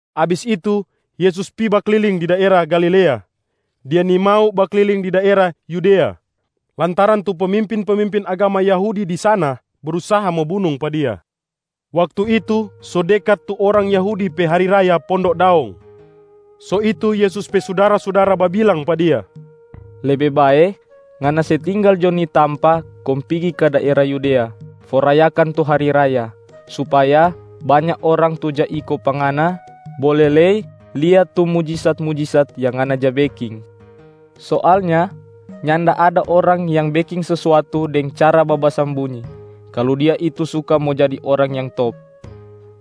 Abis itu, Yesus pi bakliling di daera Galilea. Dia nimau bakliling di daera Yudea lantaran tu pemimpin-pemimpin agama Yahudi di sana brusaha mo bunung pa Dia. Waktu itu, so dekat tu orang Yahudi pe hari raya Pondok Daong.a So itu Yesus pe sudara-sudara babilang pa Dia, “Lebe bae Ngana se tinggal jo ni tampa kong pigi ka daera Yudea for rayakan tu hari raya, supaya banya orang tu ja iko pa Ngana bole lei lia tu mujisat-mujisat yang Ngana ja beking. Soalnya nyanda ada orang yang beking sesuatu deng cara babasambunyi kalu dia itu suka mo jadi orang yang top.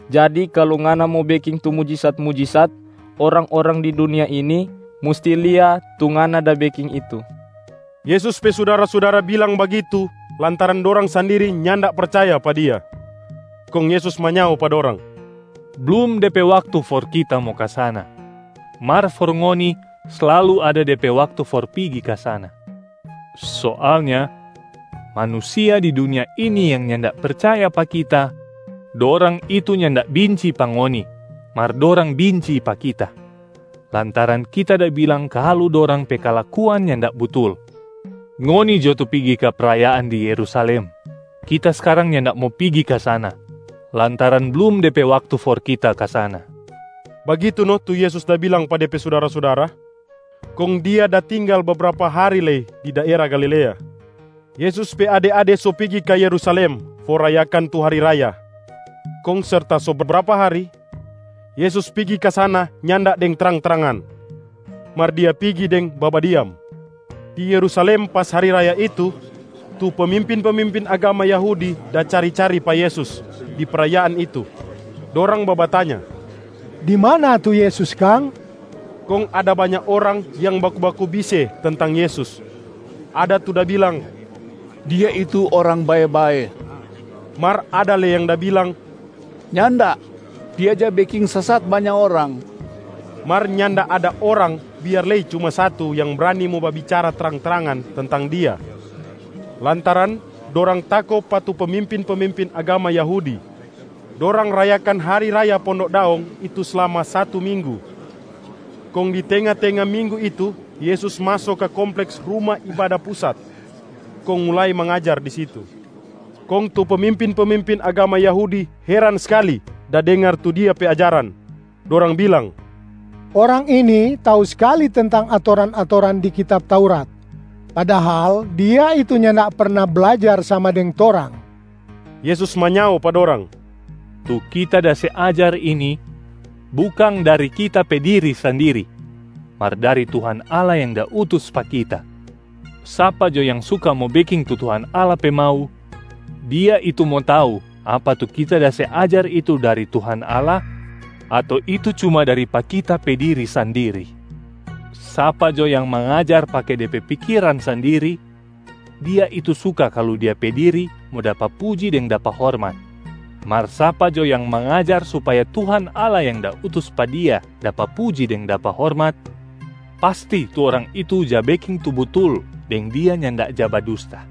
Jadi kalu Ngana mo beking tu mujisat-mujisat, orang-orang di dunia ini musti lia tu Ngana da beking itu.” Yesus pe sudara-sudara bilang bagitu lantaran dorang sandiri nyanda percaya pa Dia. Kong Yesus manyao pa dorang, “Blum de pe waktu for Kita mo ka sana, mar for ngoni slalu ada de pe waktu for pigi ka sana. Soalnya manusia di dunia ini yang nyanda percaya pa Kita, dorang itu nyanda binci pa ngoni mar dorang binci pa Kita, lantaran Kita da bilang kalu dorang pe kalakuan nyanda butul. Ngoni jo tu pigi ka prayaan di Yerusalem. Kita skarang nyanda mo pigi ka sana lantaran blum de pe waktu for Kita ka sana.” Bagitu no tu Yesus da bilang pa Dia pe sudara-sudara, kong Dia da tinggal bebrapa hari lei di daera Galilea. Yesus pe ade-ade so pigi ka Yerusalem for rayakan tu hari raya. Kong serta so bebrapa hari, Yesus pigi ka sana nyanda deng trang-trangan mar Dia pigi deng babadiam. Di Yerusalem pas hari raya itu, tu pemimpin-pemimpin agama Yahudi da cari-cari pa Yesus di prayaan itu, dorang babatanya, “Di mana tu Yesus kang?” Kong ada banya orang yang baku-baku bise tentang Yesus. Ada tu da bilang, “Dia itu orang bae-bae.” Mar ada lei yang da bilang, “Nyanda, Dia ja beking sesat banya orang.” Mar nyanda ada orang biar lei cuma satu yang brani mo babicara trang-trangan tentang Dia, lantaran dorang tako pa tu pemimpin-pemimpin agama Yahudi. Dorang rayakan hari raya Pondok Daong itu slama satu minggu, kong di tenga-tenga minggu itu Yesus maso ka kompleks Ruma Ibada Pusat kong mulai mangajar di situ. Kong tu pemimpin-pemimpin agama Yahudi heran skali da dengar tu Dia pe ajaran, dorang bilang, “Orang ini tau skali tentang atoran-atoran di kitab Taurat, padahal Dia itu nyanda perna blajar sama deng torang.” Yesus manyao pa dorang, “Tu Kita da se ajar ini, bukang dari Kita pe diri sandiri, mar dari Tuhan Allah yang da utus pa Kita. Sapa jo yang suka mo beking tu Tuhan Allah pe mau, dia itu mo tau apa tu Kita da se ajar itu dari Tuhan Allah ato itu cuma dari pa Kita pe diri sandiri. Sapa jo yang mangajar pake de pe pikiran sandiri, dia itu suka kalu de pe diri mo dapa puji deng dapa hormat. Mar sapa jo yang mangajar supaya Tuhan Allah yang da utus pa dia dapa puji deng dapa hormat, pasti tu orang itu ja beking tu butul deng dia nyanda ja badusta.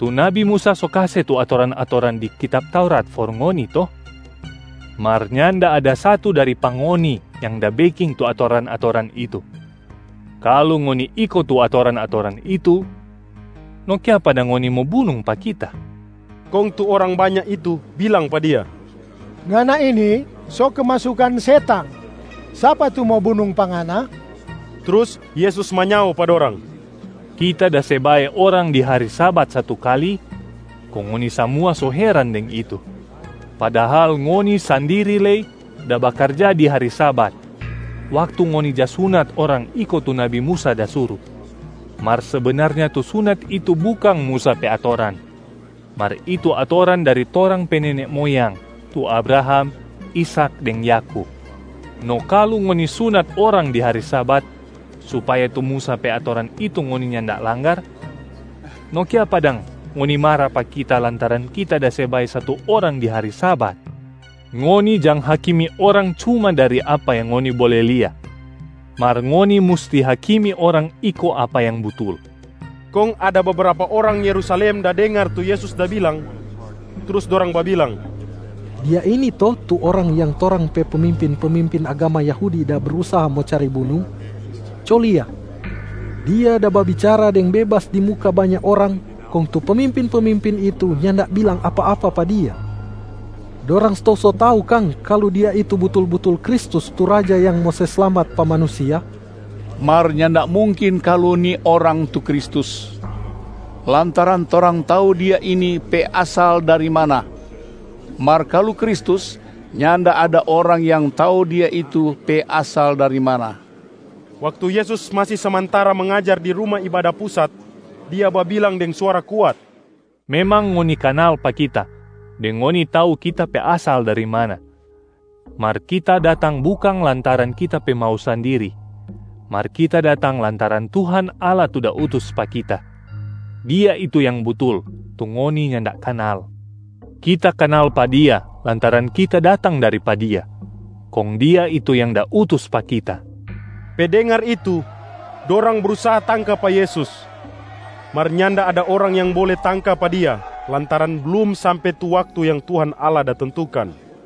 Tu nabi Musa so kase tu atoran-atoran di kitab Taurat for ngoni to? Mar nyanda ada satu dari pa ngoni yang da beking tu atoran-atoran itu. Kalu ngoni iko tu atoran-atoran itu, no kiapa dang ngoni mo bunung pa Kita?” Kong tu orang banya itu bilang pa Dia, “Ngana ini so kemasukan setang! Sapa tu mo bunung pa Ngana?” Trus Yesus manyao pa dorang, “Kita da se bae orang di hari Sabat satu kali, kong ngoni samua so heran deng itu. Padahal ngoni sandiri lei da bakarja di hari Sabat waktu ngoni ja sunat orang iko tu nabi Musa da suru. Mar sebenarnya tu sunat itu bukang Musa pe atoran, mar itu atoran dari torang pe nene moyang tu Abraham, Ishak deng Yakub. No kalu ngoni sunat orang di hari Sabat, supaya tu Musa pe atoran itu ngoni nyanda langgar, no kiapa dang ngoni mara pa Kita lantaran Kita da se bae satu orang di hari Sabat? Ngoni jang hakimi orang cuma dari apa yang ngoni bole lia, mar ngoni musti hakimi orang iko apa yang butul.” Kong ada bebrapa orang Yerusalem da dengar tu Yesus da bilang, trus dorang babilang, “Dia ini to tu Orang yang torang pe pemimpin-pemimpin agama Yahudi da brusaha mo cari bunung? Co lia, Dia da babicara deng bebas di muka banya orang kong tu pemimpin-pemimpin itu nyanda bilang apa-apa pa Dia. Dorang stou so tau kang kalu Dia itu butul-butul Kristus tu Raja yang mo se slamat pa manusia? Mar nyanda mungkin kalu ni Orang tu Kristus, lantaran torang tau Dia ini pe asal dari mana. Mar kalu Kristus, nyanda ada orang yang tau Dia itu pe asal dari mana.” Waktu Yesus masi samantara mangajar di Ruma Ibada Pusat, Dia babilang deng suara kuat, “Memang ngoni kanal pa Kita deng ngoni tau Kita pe asal dari mana. Mar Kita datang bukang lantaran Kita pe mau sandiri, mar Kita datang lantaran Tuhan Allah tu da utus pa Kita. Dia itu yang butul, tu ngoni nyanda kanal. Kita kanal pa Dia lantaran Kita datang dari pa Dia, kong Dia itu yang da utus pa Kita.” Pe dengar itu, dorang brusaha tangka pa Yesus, mar nyanda ada orang yang bole tangka pa Dia lantaran blum sampe tu waktu yang Tuhan Allah da tentukan.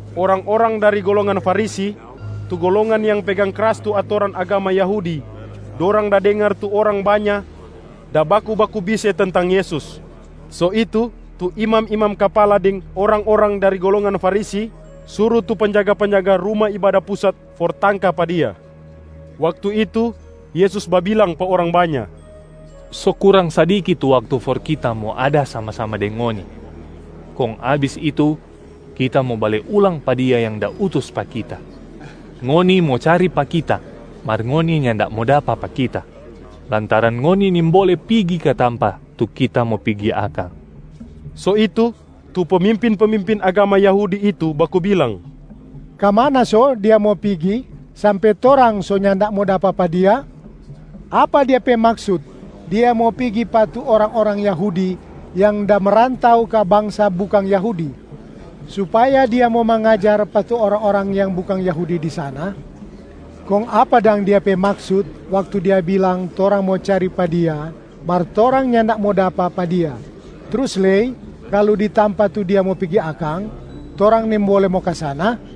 Orang-orang dari golongan Farisi, tu golongan yang pegang kras tu atoran agama Yahudi, dorang da dengar tu orang banya da baku-baku bise tentang Yesus. So itu, tu imam-imam kapala deng orang-orang dari golongan Farisi suru tu penjaga-penjaga Ruma Ibada Pusat for tangka pa Dia. Waktu itu, Yesus babilang pa orang banya, “So kurang sadiki tu waktu for Kita mo ada sama-sama deng ngoni. Kong abis itu Kita mo bale ulang pa Dia yang da utus pa Kita. Ngoni mo cari pa Kita mar ngoni nyanda mo dapa pa Kita, lantaran ngoni nimbole pigi ka tampa tu Kita mo pigi akang.” So itu, tu pemimpin-pemimpin agama Yahudi itu baku bilang, “Ka mana so Dia mo pigi sampe torang so nyanda mo dapa pa Dia? Apa Dia pe maksut Dia mo pigi pa tu orang-orang Yahudi yang da merantau ka bangsa bukang Yahudi, supaya Dia mo mangajar pa tu orang-orang yang bukang Yahudi di sana? Kong apa dang Dia pe maksut waktu Dia bilang torang mo cari pa Dia mar torang nyanda mo dapa pa Dia, trus lei kalu di tampa tu Dia mo pigi akang, torang nimbole mo ka sana?”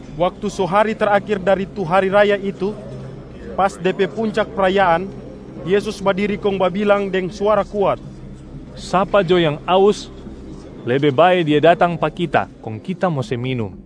Waktu so hari terakhir dari tu hari raya itu, pas de pe puncak prayaan, Yesus badiri kong babilang deng suara kuat, “Sapa jo yang aus, lebe bae dia datang pa Kita kong Kita mo se minum.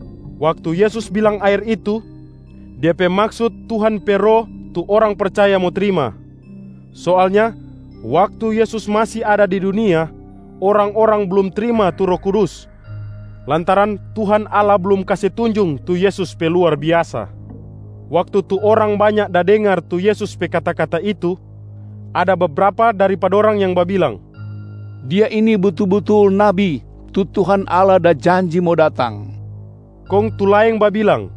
Waktu Yesus bilang aer itu, Dia pe maksut Tuhan pe Roh tu orang percaya mo trima. Soalnya waktu Yesus masi ada di dunia, orang-orang blum trima tu Roh Kudus lantaran Tuhan Allah blum kase tunjung tu Yesus pe luar biasa.b Waktu tu orang banya da dengar tu Yesus pe kata-kata itu, ada bebrapa dari pa dorang yang babilang, “Dia ini butul-butul nabi tu Tuhan Allah da janji mo datang.” Kong tu laeng babilang,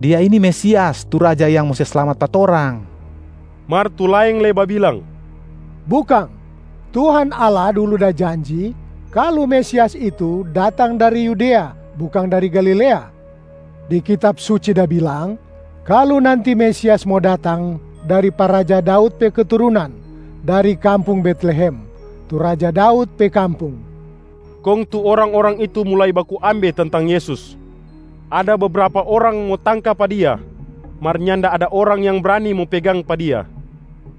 “Dia ini Mesias, Tu Raja yang mo se slamat pa torang.” Mar tu laeng lei babilang, “Bukang, Tuhan Allah dulu da janji kalu Mesias itu datang dari Yudea bukang dari Galilea. Di Kitab Suci da bilang kalu nanti Mesias mo datang dari pa raja Daud pe keturunan dari kampung Betlehem, tu raja Daud pe kampung.” Kong tu orang-orang itu mulai baku ambe tentang Yesus. Ada bebrapa orang mo tangka pa Dia, mar nyanda ada orang yang brani mo pegang pa Dia.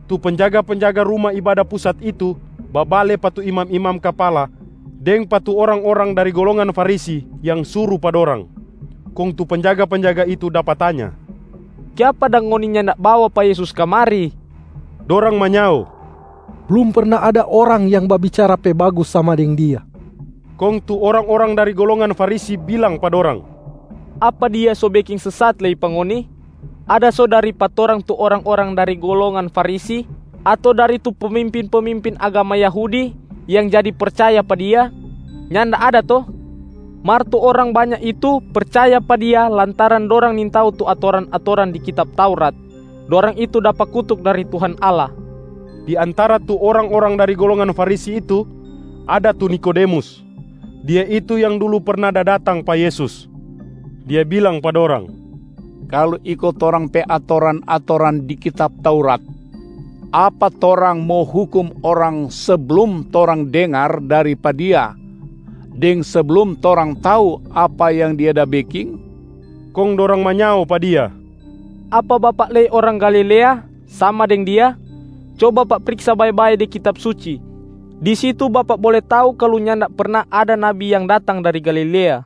Tu penjaga-penjaga Ruma Ibada Pusat itu babale pa tu imam-imam kapala deng pa tu orang-orang dari golongan Farisi yang suru pa dorang, kong tu penjaga-penjaga itu dapa tanya, “Kiapa dang ngoni nyanda bawa pa Yesus kamari?” Dorang manyao, “Blum perna ada orang yang babicara pe bagus sama deng Dia.” Kong tu orang-orang dari golongan Farisi bilang pa dorang, “Apa Dia so beking sesat lei pa ngoni? Ada so dari pa torang tu orang-orang dari golongan Farisi ato dari tu pemimpin-pemimpin agama Yahudi yang jadi percaya pa Dia? Nyanda ada to? Mar tu orang banya itu percaya pa Dia lantaran dorang nintau tu atoran-atoran di kitab Taurat, dorang itu dapa kutuk dari Tuhan Allah.” Di antara tu orang-orang dari golongan Farisi itu ada tu Nikodemus. Dia itu yang dulu perna da datang pa Yesus. Dia bilang pa dorang, “Kalu iko torang pe atoran-atoran di kitab Taurat, apa torang mo hukum orang seblum torang dengar dari pa dia deng seblum torang tau apa yang dia da beking?” Kong dorang manyao pa dia, “Apa bapak lei orang Galilea sama deng Dia? Co bapak priksa bae-bae di Kitab Suci, di situ bapak bole tau kalu nyanda perna ada nabi yang datang dari Galilea.” [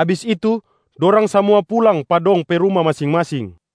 Abis itu, dorang samua pulang pa dong pe ruma masing-masing.